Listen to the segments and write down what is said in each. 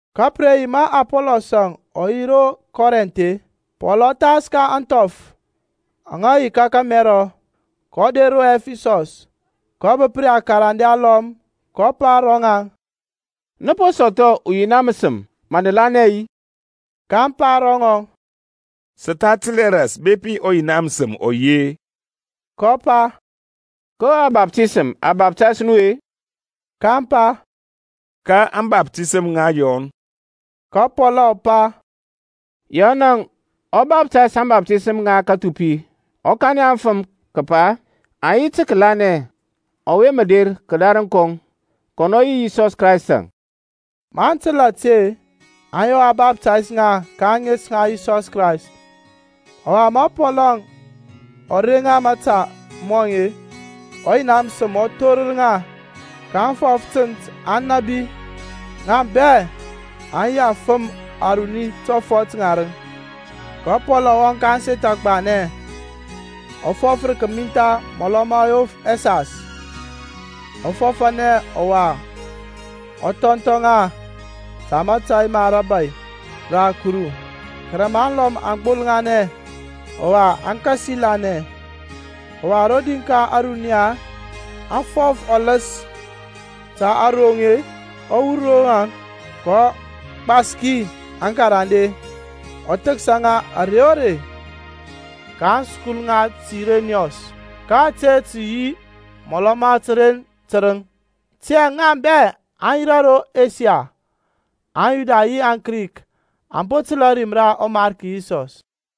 Ka pə re yi ma Apɔlɔsȧŋ ɔ yi ro Kɔrinth-e, Pɔl ɔ thas ka ȧŋthɔf aŋa yi ka kȧmɛrɔ, kɔ der ro Ɛfisɔs, kɔ bəp ri akarande alɔm. kɔ pa ro ŋaŋ, Nə po sɔthɔ ɔYina məsəm ma nə lanɛ-i? kaŋ pa ro ŋɔŋ, Sə tha təl hɛ ras bepi ɔYina məsəm ɔ yi-e. kɔ pa, Ko ȧbaftisəm a baftays nu-e? kaŋ pa, Ka ȧŋbaftisəm ŋa Yɔn. Ka Pɔl ɔ pa, Yɔnȧŋ ɔ baftays ȧŋbaftisəm ŋa kathupi, ɔ kanɛ aŋfəm kəpa aŋ yi tə kəlanɛ ɔwe mə der kədarəŋ kɔŋ, kɔnɔ yi Yisɔs Kraystȧŋ. Maŋ təl ȧte, aŋ yɔ a baftays ŋa ka ȧŋes ŋa Yisɔs Krayst. Ɔwa ma Pɔl ɔ reŋ ŋa mȧta mɔŋ-e, ɔYina məsəm ɔ thorər ŋa; kaŋ fɔf tənt, aŋ nȧbi. Ŋa bɛ aŋ yi afəm aruni tɔfɔt ŋarəŋ. Ka Pɔlȧŋ ɔ wɔŋ ka ȧŋseth agbanɛ, ɔ fɔf rə kəmintha mɔlɔ ma yof ɛsas, ɔ fɔfȧnɛ ɔwa ɔ thɔnthɔ ŋa ta mȧtȧy ma rȧbȧy ra Kuru. Kɛrɛ ma alɔm aŋ gbolŋanɛ, ɔwa aŋ kasi lanɛ, ɔwa rodi ka ȧruniya aŋ fɔf ɔləs ta aRoŋ-e, ɔ wur ro ŋaŋ, kɔ gbaski aŋkarande, ɔ thəksa ŋa ȧrey o rey ka aŋskul ŋa Tirenɔs. Ka ȧte tə yi mɔlɔ ma təren tərəŋ. Tiyȧŋ ŋa bɛ aŋa yirȧ ro Asia, aŋYuda yi aŋKrik, aŋ po təl ȧrim ra ɔMarki Yisɔs.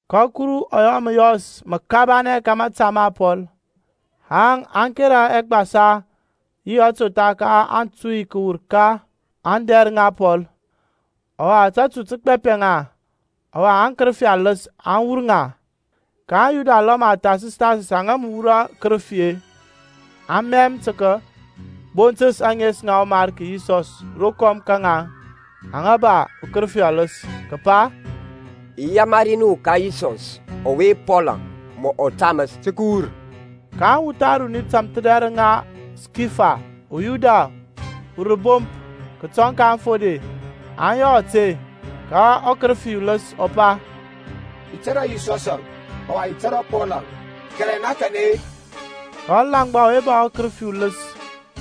Ka Kuru ɔ yɔ məyɔs məkabanɛ ka mȧta ma Pɔl, haŋ a kera ɛgbasa yi atotha ka aŋtuy kəwur ka ȧŋdɛr ŋa Pɔl, ɔwa tatu tə gbapɛ ŋa, ɔwa aŋkərəfi aləs aŋ wur ŋa. kaŋ Yuda alɔm athasəs-thasəs aŋa mə wurɔ akərəfi-e, aŋ mɛm tə kəbontəs ȧŋes ŋa ɔMarki Yisɔs rokɔm ka ŋaŋ aŋa ba akərəfi aləs, kəpa, I yamari nu ka Yisɔs ɔwe Pɔlȧŋ mɔ taməs, tə kəwur. Ka awuth aruni tȧmthədɛrəŋ ŋa Skifa, uYuda, urəbomp kətɔŋ ka aŋfode, aŋ yɔ ȧte. Ka ɔkərəfi uləs ɔ pa, I tȧrȧ Yisɔsȧŋ, ɔwa i tȧrȧ Pɔlȧŋ, kɛrɛ na kanɛ-e? Ka ɔlaŋgba ɔwe ba ɔkərəfi uləs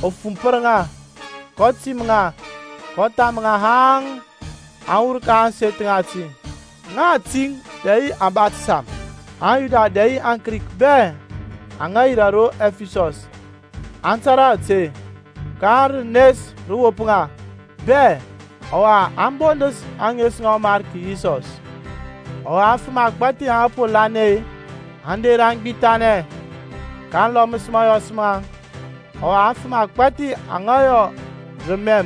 ɔ fumpər ŋa, kɔ tim ŋa, kɔ tham ŋa haŋ aŋ wur ka ȧŋseth ŋati, ŋa atiŋ dɛ yi kəba təsam. AŋYuda dɛ yi aŋKrik bɛ aŋa yirȧ ro Ɛfisɔs, aŋ tȧrȧ ȧte, ka rənes rə wop ŋa bɛ, ɔwa aŋ bondəs ȧŋes ŋa ɔMarki Yisɔs. Ɔwa afəm agbȧthi aŋa po lanɛ-e, aŋ der aŋ gbithanɛ, kaŋ lɔməs mȧyɔs maŋ. Ɔwa afəm agbȧthi aŋa yɔ rəmɛn,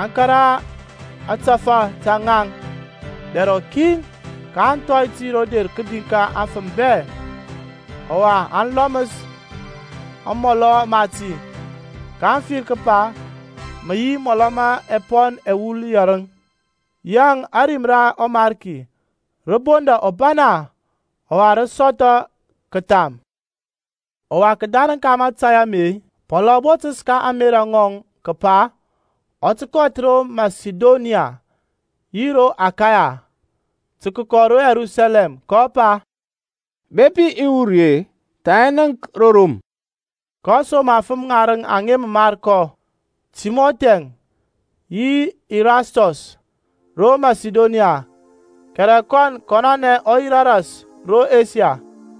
aŋ kȧrȧ ȧtȧfȧ ta ŋaŋ dɛr rɔkin, kaŋ thɔy ti ro der kədi ka aŋfəm bɛ; ɔwa aŋ lɔməs amɔlɔ mati, kaŋ fir kəpa mə yi mɔlɔ ma ɛpɔn ɛwul yɛrəŋ. Yaŋ ȧrim ra ɔMarki rə bondȧ ɔbana, ɔwa rə sɔthɔ kətham. Ɔwa kədarəŋ ka mȧtȧy ame-e, Pɔlȧŋ ɔ botəs ka ȧŋmerȧ ŋɔŋ kəpa ɔ tə kɔth ro Masidonia yi ro Akaya, tə kəkɔ ro Yerusalɛm, kɔ pa, Bepi i wur ri-e, tha i nənk ro Rom. kɔ som afəm ŋarəŋ aŋa mə mar kɔ, Timɔthi-əŋ yi Irastɔs, ro Masidonia, kɛrɛ kɔn kɔnɔnɛ ɔ yirȧ ras ro Asia.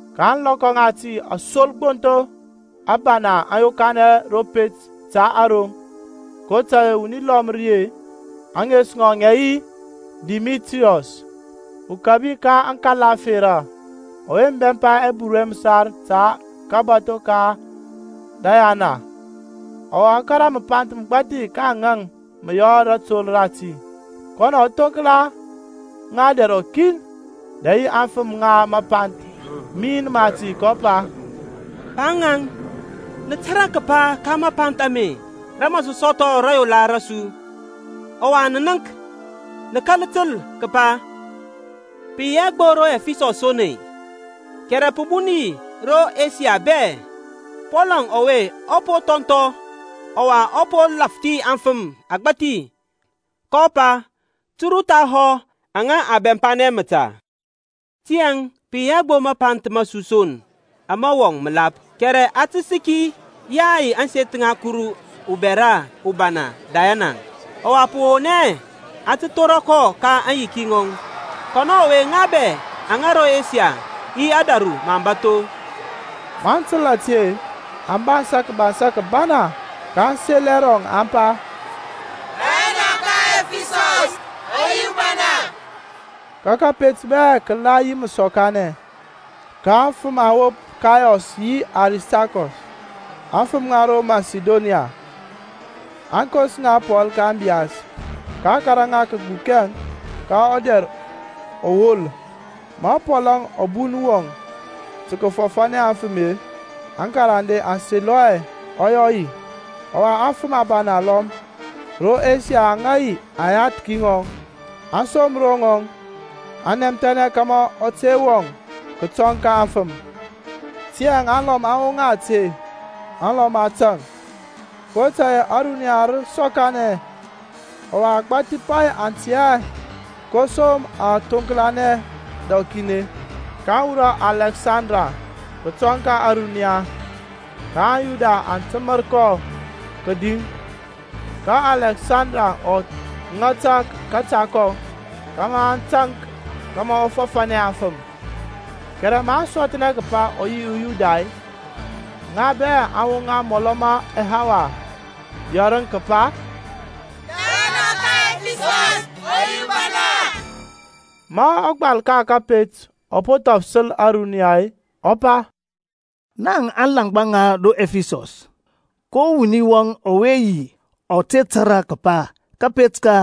Ȧŋlɔkɔ ŋati asolgbontho abana aŋ yokanɛ ro pet ta aRoŋ, kotȧy-e wuni lɔm ri-e, ȧŋes ŋɔŋ ŋȧ yi Dimitriyɔs, ukȧbi ka ȧŋkala ȧferȧ, ɔwe mə bɛmpa ɛburu ɛ məsar ta kabȧtho ka Dayana, ɔwa ɔ kȧrȧ məpanth məgbȧthi ka aŋa mə yɔ rȧtol rati; kɔnɔ thoŋkla ŋa dɛr rɔkin, dɛ yi aŋfəm ŋa mapanth min mati, kɔ pa, Pa ŋaŋ, nə tȧrȧ kəpa ka mȧpanth ame rȧ mȧ sə sɔthɔ rȧyola rȧsu. Ɔwa nə nənk, nə kȧl təl kəpa pə yi hɛ gbo ro Ɛfisɔs son-e, kɛrɛ pə bun yi ro Asia bɛ, Pɔlȧŋ ɔwe ɔ po thɔnthɔ ɔwa ɔ po lȧfthi afəm agbȧthi, kɔ pa, Turu thahɔ aŋa a bɛmpanɛ məta. Tiyȧŋ pə yi hɛ gbo mapanth ma su son ama wɔŋ məlap, kɛrɛ a tə səki ȧŋseth ŋa ɔkuru ubɛra ubana Dayanaŋ, ȧyay ɔwa pə won hɛ a tə thora kɔ ka aŋyiki ŋɔŋ, kɔnɔ ɔwe ŋa bɛ ro Asia yi ȧdȧru məaŋ bȧtho. Maŋ təl ȧte-e, aŋ bansȧ kəbansa kəbana, kaŋ sel ɛrɔŋ, aŋ pa, Dayana ɔka aŋƐfisɔs ɔ yi ubana. Ka kȧpet bɛ kə la yi məsɔkanɛ, ka aŋfəm aŋ wop Kayɔs yi Aristarkɔs, afəm ŋa ro Masidonia, aŋkos ŋa Pɔl ka ȧŋbiyas, kaŋ kȧrȧ ŋa kəgbukɛŋ ka ɔdɛr ɔwol. Ma Pɔlȧŋ ɔ bun wɔŋ tə kəfɔfanɛ aŋfəm-e, aŋkarande aŋ selɔ hɛ ɔ yɔ yi. Ɔwa afəm abana alɔm ro Asia aŋa yi aŋyathki ŋɔŋ, aŋ som ro ŋɔŋ, aŋ nɛmthɛnɛ kȧmȧ ɔ te wɔŋ kətɔŋ ka aŋfəm. Tiyȧŋ alɔm aŋ woŋa ȧte, alɔm ȧtȧŋ, kotȧy-e ȧruniya rə sɔkanɛ; ɔwa agbȧthi pay aŋ tɛ hɛ ko som aŋ thoŋklanɛ dɛr rɔkin. kaŋ wurɔ Alɛksandər kətɔŋ ka ȧruniya, ka aŋYuda aŋ təmər kɔ kədi. Ka Alɛksandər ɔ ŋata kȧta kɔŋ kȧmȧ aŋ taŋk kȧmȧ ɔ fɔfȧnɛ aŋfəm. Kɛrɛ maŋ sɔthnɛ kəpa ɔ yi uYuda-e, ŋa bɛ aŋ woŋa mɔlɔ ma ɛhawa yɛrəŋ kəpa, Dayana ɔka aŋƐfisɔs ɔ yi ubana. Ma ɔgbal ka kȧpet ɔ po thɔfələs ȧruniya-e ɔ pa, Naŋ alaŋgba ŋa ro Ɛfisɔs, ko wuni wɔŋ ɔwe te tȧrȧ kəpa kȧpet ka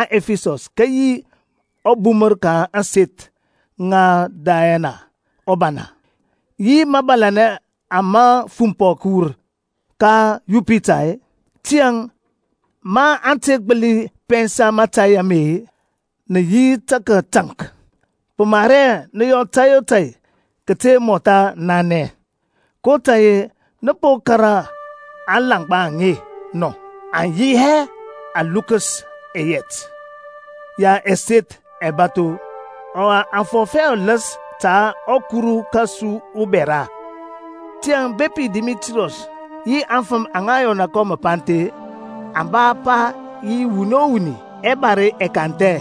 aŋƐfisɔs kə yi ɔbumər ka ȧŋseth ŋa Dayana ubana, yi mȧbȧlȧnɛ ama fumpɔ kəwur ka Yupita-e? Tiyȧŋ ma a te gbəli pɛnsa mȧtȧy ame-e, nə yi tə kətaŋk, pə mar hɛ nə yɔ tȧy o tȧy kəte mɔtha nanɛ. kotȧy-e nə po kȧrȧ aŋlaŋgba aŋe nɔ; aŋ yi hɛ alukəs ɛyɛt ya ɛseth ɛbȧtho, ɔwa aŋ fɔf hɛ ɔləs ta ɔkuru kȧsu ubɛra. Tiyȧŋ bepi Dimitriyɔs yi aŋfəm aŋa yɔna kɔ məpanth-e, aŋ ba apa yi wuni o wuni, ɛbare ɛ kanthɛ,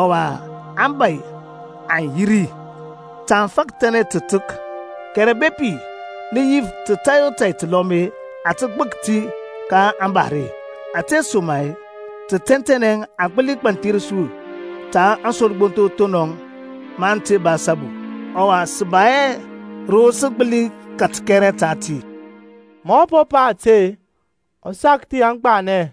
ɔwa aŋbȧy aŋ yi ri. Ta aŋ fȧkəthȧnɛ tətək. Kɛrɛ bepi nə yif ta tȧy o tȧy təlɔm-e, a tə gbək ti ka ȧŋbare. Ȧtesoma-e, tə tɛntɛnɛ a gbəli gbanthir su ta aŋsolgbontho thonɔŋ, maŋ te ba asabu. Ɔwa sə ba hɛ ro sə gbəli kat kɛrɛ ta ti. Ma ɔ po pa ȧte-e, ɔ sakthi aŋgbanɛ.